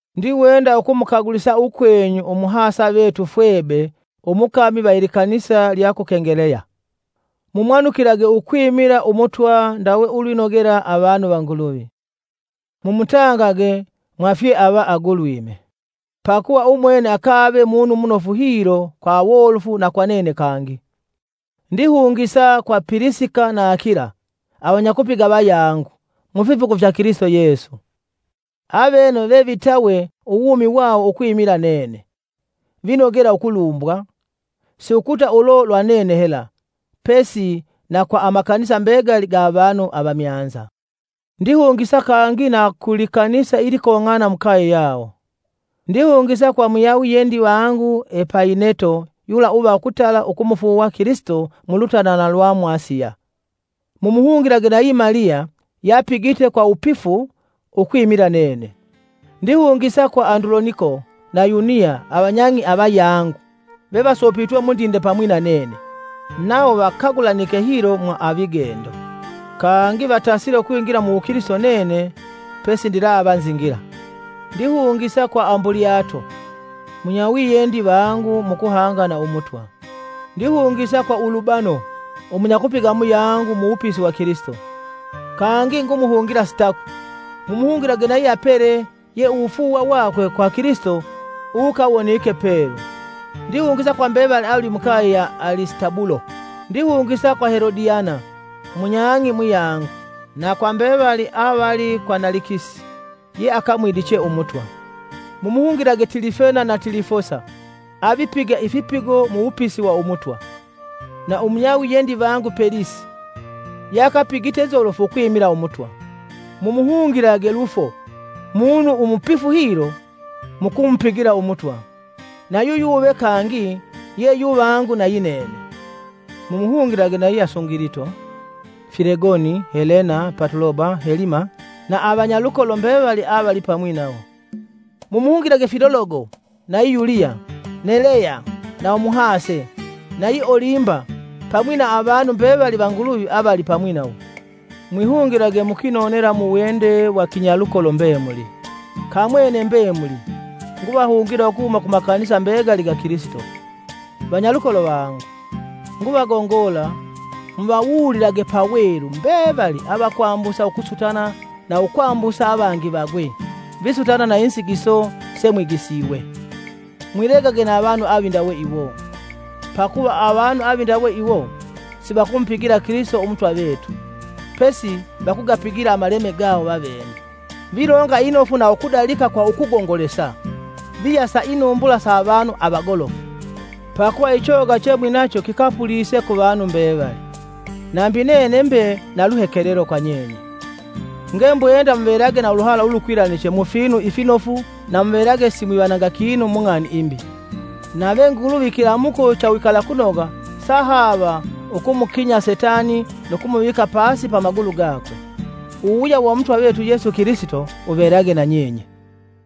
Ndiwenda ukumukagulisa ukwenyu Umuhasa vetu Fwebe umukami va ilikanisa lya ku Kengeleya. Mumwanukilage ukwimila Umutwa ndawe ulwinogela avanu va Nguluvi. Mumutangage mwa fyeava agulwime, pakuva umwene akave munu munofu hilo kwa awolofu na kwa nene kangi. Ndihungisa kwa Pilisika na Akila, avanyakupiga vayangu mufipigo fya Kilisito Yesu. Avene vevitawe uwumi wawo ukwimila nene. Vinogela ukulumbwa, si ukuta ulo lwa nene hela, pesi na kwa amakanisa mbegali ga avanu avamyanza. Ndihungisa kangi na ku likanisa ilikong'ana mukaye yawo. Ndihungisa kwa munyawiyendi vangu Epayineto yula uva ukutala ukumufuuwa Kilisito mulutanana lwa mu Asiya. Mumuhungilage nayi Maliya yeapigite kwa wupifu ukwimila nene. Ndihungisa kwa Anduloniko na Yuniya avanyang'i avayangu vevasopitwe mundinde pamwi na nene; nawo vakagulanike hilo mwa avigendo, kangi vatasile ukwingila mu wukilisito nene pesindilava nzingila. Ndihungisa kwa Ambulyato, munyawiyendi vangu mu kuhanga na Umutwa. Ndihungisa kwa Ulubano, umunyakupiga muyangu mu wupisi wa Kilisito, kangi ngumuhungila Sitaku. Mumuhungilage nayi Apele ye uwufuuwa wakwe kwa Kilisito uwukawonike pelu. Ndihungisa kwa mbevali avali mukaye ya Alisitabulo. Ndihungisa kwa Helodiana, munyang'i muyangu; na kwa mbevali avali kwa Nalikisi yeakamwidiche Umutwa. Mumuhungilage Tilifena na Tilifosa avipiga ifipigo mu wupisi wa Umutwa, na umunyawiyendi vangu Pelisi ye akapigite nzolofu ukwimila Umutwa. Mumuhungilage Lufo, munu umupifu hilo mu kumupigila Umutwa, nayu yuve kangi ye yuvangu nayinene, mumuhungilage nayi Asungilito, Filegoni, Helena, Patuloba, Helima na avanyalukolo mbevali avali pamwi nawo. Mumuhungilage Filologo nayi Yuliya, Neleya na umuhase, nayi Olimba pamwi na avanu mbevali va Nguluvi avali pamwi nawo. Mwihungilage mukwinonela muwende wa kinyalukolo mbemuli. Kamwene mbemuli nguvahungila ukuhuma ku makanisa mbegali ga Kilisito. Vanyalukolo vangu, nguvagongola muvawuulilage pawelu mbevali avakwambusa ukusutana na ukwambusa avangi vagwe, visutana na inzigiso semwigisiwe. Mwilegage na avanu avindawe iwo, pakuva avanu avindawe iwo sivakumupigila Kilisito Umutwa vetu, pesi vakugapigila amaleme gawo vavene. Vilonga inofu na ukudalika kwa ukugongolesa viyasa inumbula sa avanu avagolofu. Pakuva ichoga chemwinacho kikapulise kuvanu mbevali, nambi nene mbe na luhekelelo kwa nyenye, ngembwenda muvelage na uluhala ulukwilaniche mufinu ifinofu na muvelage simwivanga kinu mung'ani imbi. Nave Nguluvi ikilamuko cha uwikalakunoga sahaava ukumukinya setani nu kumuvika pasi pa magulu gakwe. Uwuwuya wa Umutwa vetu Yesu Kilisito wuvelage nanyenye.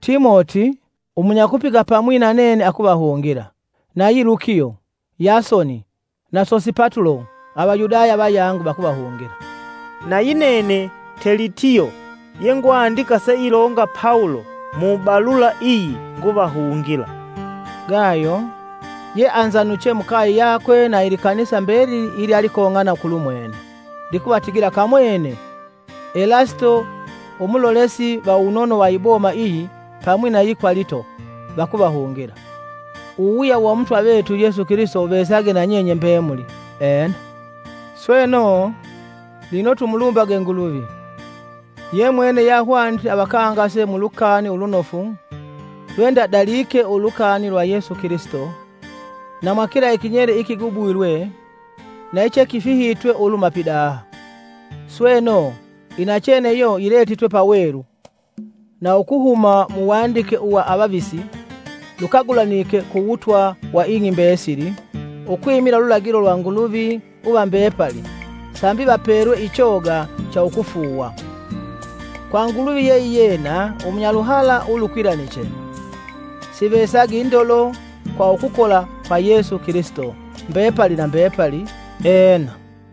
Timoti, umunyakupiga pamwi na nene akuvahungila, nayi Lukio, Yasoni na Sosipatulo Avayudaya vayangu vakuvahungila. Nayi nene Telitio ye ngwandika seilonga Pawulo mubalula iyi nguvahungila. Gayo, yeanzanuche mukaye yakwe na likanisa mbelili ilyalikong'ana kulumwene, likuvatigila kamwene, Elasito, umulolesi va uwunono wa iboma iyi pamwi nayi Kwalito, vakuvahungila. [ Uwuwuya wa Umutwa vetu Yesu Kilisito wuvesage na nyenye mbemuli. Ena.] Sweno, lino tumulumbage Nguluvi! Ye mwene yeahwanite avakangase mu lukani ulunofu lwe ndadalike ulukani lwa Yesu Kilisito, na mwa kila ikinyele ikigubwilwe na ichekifihitwe uluhuma pidaha. Sweno, inachene iyo yiletitwe pawelu na ukuhuma muwandike uwa avavisi lukagulanike ku wutwa wa ing'i mbesili, ukwimila ululagilo lwa Nguluvi uva mbepali sambi vapelwe ichoga cha ukufuuwa. Kwa Nguluvi yeiyena umunyaluhala ulukwilaniche, sivesage indolo kwa ukukola kwa Yesu Kilisito, mbepali na mbepali! Ena.